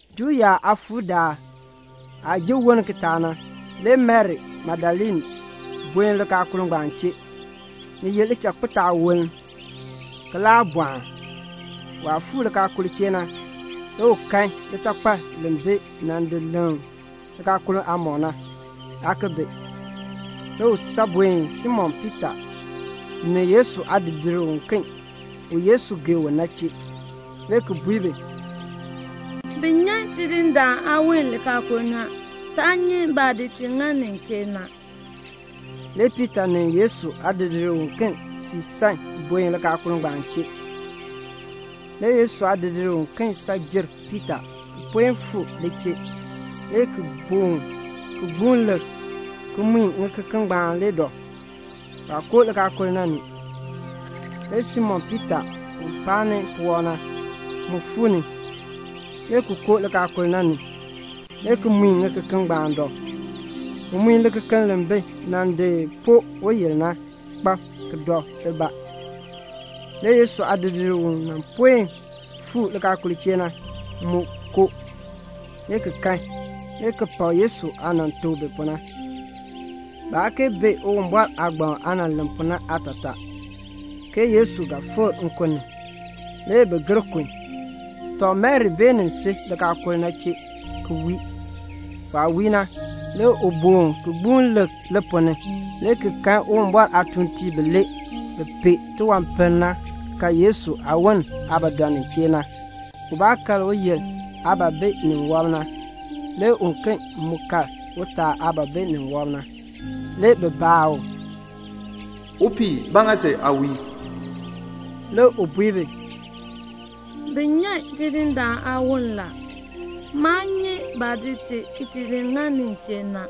Juu yaab aakpakool daal aah ji woln kitaak na, le Mari Magdalene buen likaakul ngbaan chee. Ni ye lichakpitaawoln, ki laa bɔɔn. Waah fuu likaakul chee na, le u kan litakpal li bi nan di leŋ likaakul aamɔb na, aa ki bi. Le u san buen Simon Piita ni Yesu aadidiir uken u Yesu gee u na chee, le ki bui bi, "Bi nyan Tidindaan aawon likaakul ni a. Taa nyi baah di ti ŋa nin chee na." Le Piita ni Yesu aadidiir uken fii san buen likaakul na chee. Le Yesu aadidiir uken san jer Piita ki puen fuu li chee, le ki boon ki gbuun lik, ki mui ŋikeken ngbaan le dɔ. Waa koo likaakul na ni. Le Simon Piita, u paani puwɔb na, mu fuu ni, le ki koo likaakul na ni, le ki mui ŋikeken ngbaan dɔ. U mui likekeln li bi nan di poo uyil na kpab ki dɔ libaa. Le Yesu aadidiir u mu puen fuu likaakul chee na, mu koo, le ki kan, le ki pak Yesu aah nan tuk bi pu na. (Baa kee bee Uwumbɔr aagbaŋ aah len pu na aatataa, ke Yesu ga fikr nkun ni.) Le bi gir kun. Tɔ, Mari beenin si likaakul na chee ki wii. Waah wii na, le u boon ki gbuun lik li ponn ni, le ki kan Uwumbɔr aatuuntiib bilee bi pee tiwanpiln na kal Yesu aawon aah ba dɔ nin chee na. Ubaa kal uyil aah ba bi ni wɔb na, le uken mu kal utaa aah ba bi ni wɔb na. Le bi baa u, "Upii, ba ŋa si aa wii?" Le u bui bi, "Bi nyan Ndindaan aawon la. Maa nyi baah di ti ki ti ŋa nin chee na."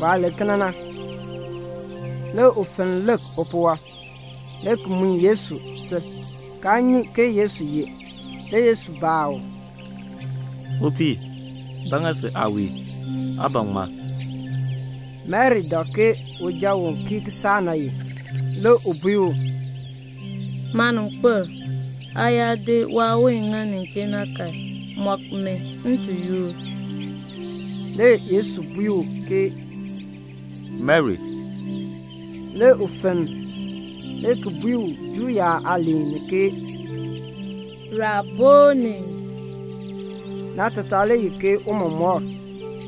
Waah len kena na, le u fenn lik upuwɔb, le ki mui Yesu sil, kaa nyi ke Yesu ye. Le Yesu baa u, "Upii, ba ŋa si aa wii? Aa ban ŋmaa?" Mari dak ke uja u kii kisaak na ye. Le u bui u, "Maaninkpil, aa yaa di waawon ŋa nin chee na kan, mɔk mi, m ti yoor." Le Yesu bui u ke, "Mari." Le u fenn, le ki bui u Juu yaab aaliin ni ke, "Raboni." (Naatataa le ye ke "Tiicha.")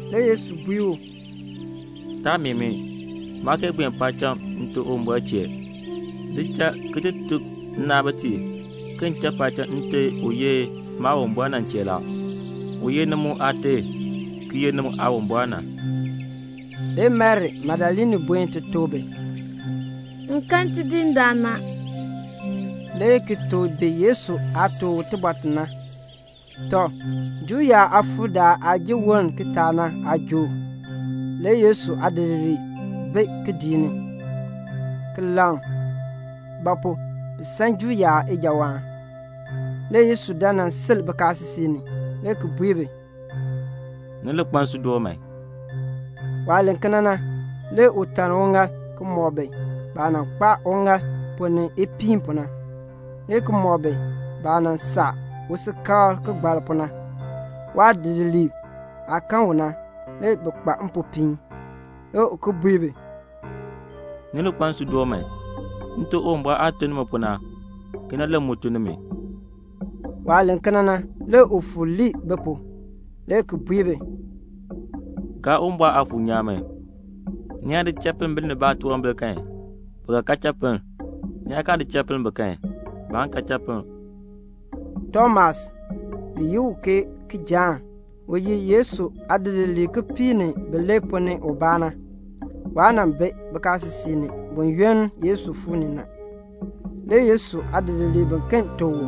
Le Yesu bui u, "Taa meeh mi. Maa kee buen paacham Nte Uwumbɔr chee. Li cha ki ti tuk nnaabitiib ke m cha paacham Nte u ye Maawumbɔr na chee la, u ye ni mu Aate ki ye ni mu Aawumbɔr na." Le Mari Magdalene buen ti tuk bi, "M kan Tidindaan a," le ki tuk bi Yesu aah tuk u tibɔr ti na. Tɔ, Juu yaab aakpakool aah jin woln kitaak na aajook le Yesu aadidiliib bi kidiik ni, le ki laŋ; ba pu? bi san Juu yaab ijawaan. Le Yesu dan nan sil bikaasisik ni, le ki bui bi, "Ni li kpa nsuudoon man." Waah len kena na, le u taln uŋaal ki mɔk bi baah nan kpaa uŋaal ponn ni ipiin pu na, le ki mɔk bi baah nan saa u usikakl kigbalk pu na. Waadidiliib aah kan u na, le bi kpa mpopiin. Le u ki bui bi, "Ni li kpa nsuudoon man. Nte Uwumbɔr aah tun ni mi pu na, kena le m mu tun nimi." Waah len kena na, le u fuur lii bi pu, le ki bui bi, "Gaa Uwumbɔr Aafuur nyaan man. Ni yaa di cha pinn binib baatunwambir kan, bi ga kan chapinn. Ni yaa kaa di cha pinn bi kan, baan kan chapinn." Tomas, bi yi u Kijaan, u ye Yesu aadidiliib kipiik ni bilee ponn ni ubaa na, waa nan bi bikaasisik ni buyoonn Yesu fuu ni na. Le Yesu aadidiliib biken tuk u,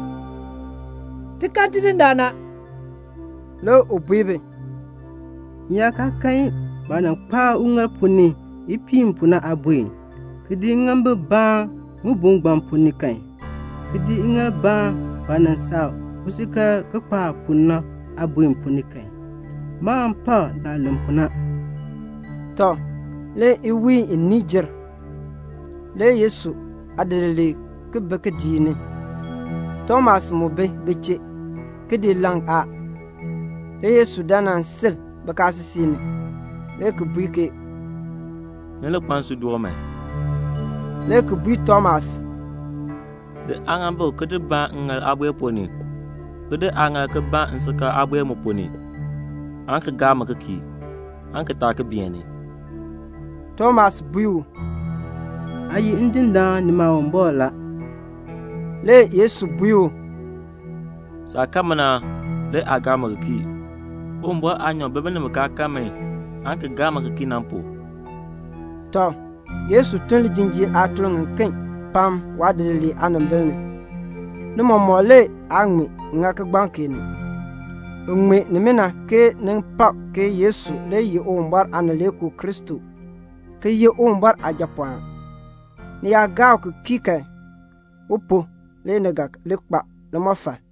"Ti kan Tidindaan a." Le u bui bi, "M yaa kaa kan baah nan kpaa uŋaal ponn ni ipiin pu na aabue, ki di ŋŋaambik baan ŋibue ngbaan ponn ni kan, ki di ŋŋaal baan baah nan saa u usikakl kigbalk pu na aabuer ponn ni kan, maan pak saah len pu na." Tɔ, le iwiin iniin jer. Le Yesu aadidiliib ki bi kidiik ni. Tomas mu bi bi chee. Kidiik laŋ a. Le Yesu dan nan sil bikaasisik ni, le ki bui ke "Ni li kpa nsuudoon man," le ki bui Tomas, "Di aaŋaambik ki baan ŋŋaal aabue ponn ni, ki di aaŋaal ki baan nsikakl aabuer mu ponn ni, aan ki gaa mi ki kii, aan ki taa ki beeni." Tomas bui u, "Aa ye Ndindaan ni Maawumbɔr la." Le Yesu bui u, "Saah kan mi na le aa gaa mi ki kii. Uwumbɔr aanyoor bi binib bi kaa kan mi aan ki gaa mi ki kii na pu." Tɔ, Yesu tun lijinjiir aatun ŋiken pam waadidiliib aanimbil ni. Ni mɔmɔk le aa ŋmee ŋa kigbaŋ kee ni. Bi ŋmee nimina ke ni pak ke Yesu le ye Uwumbɔr Aanileekoo Kristo ki ye Uwumbɔr Aajapɔɔn. Ni yaa gaa u ki kii kan, u pu le ni ga li kpa limɔfal.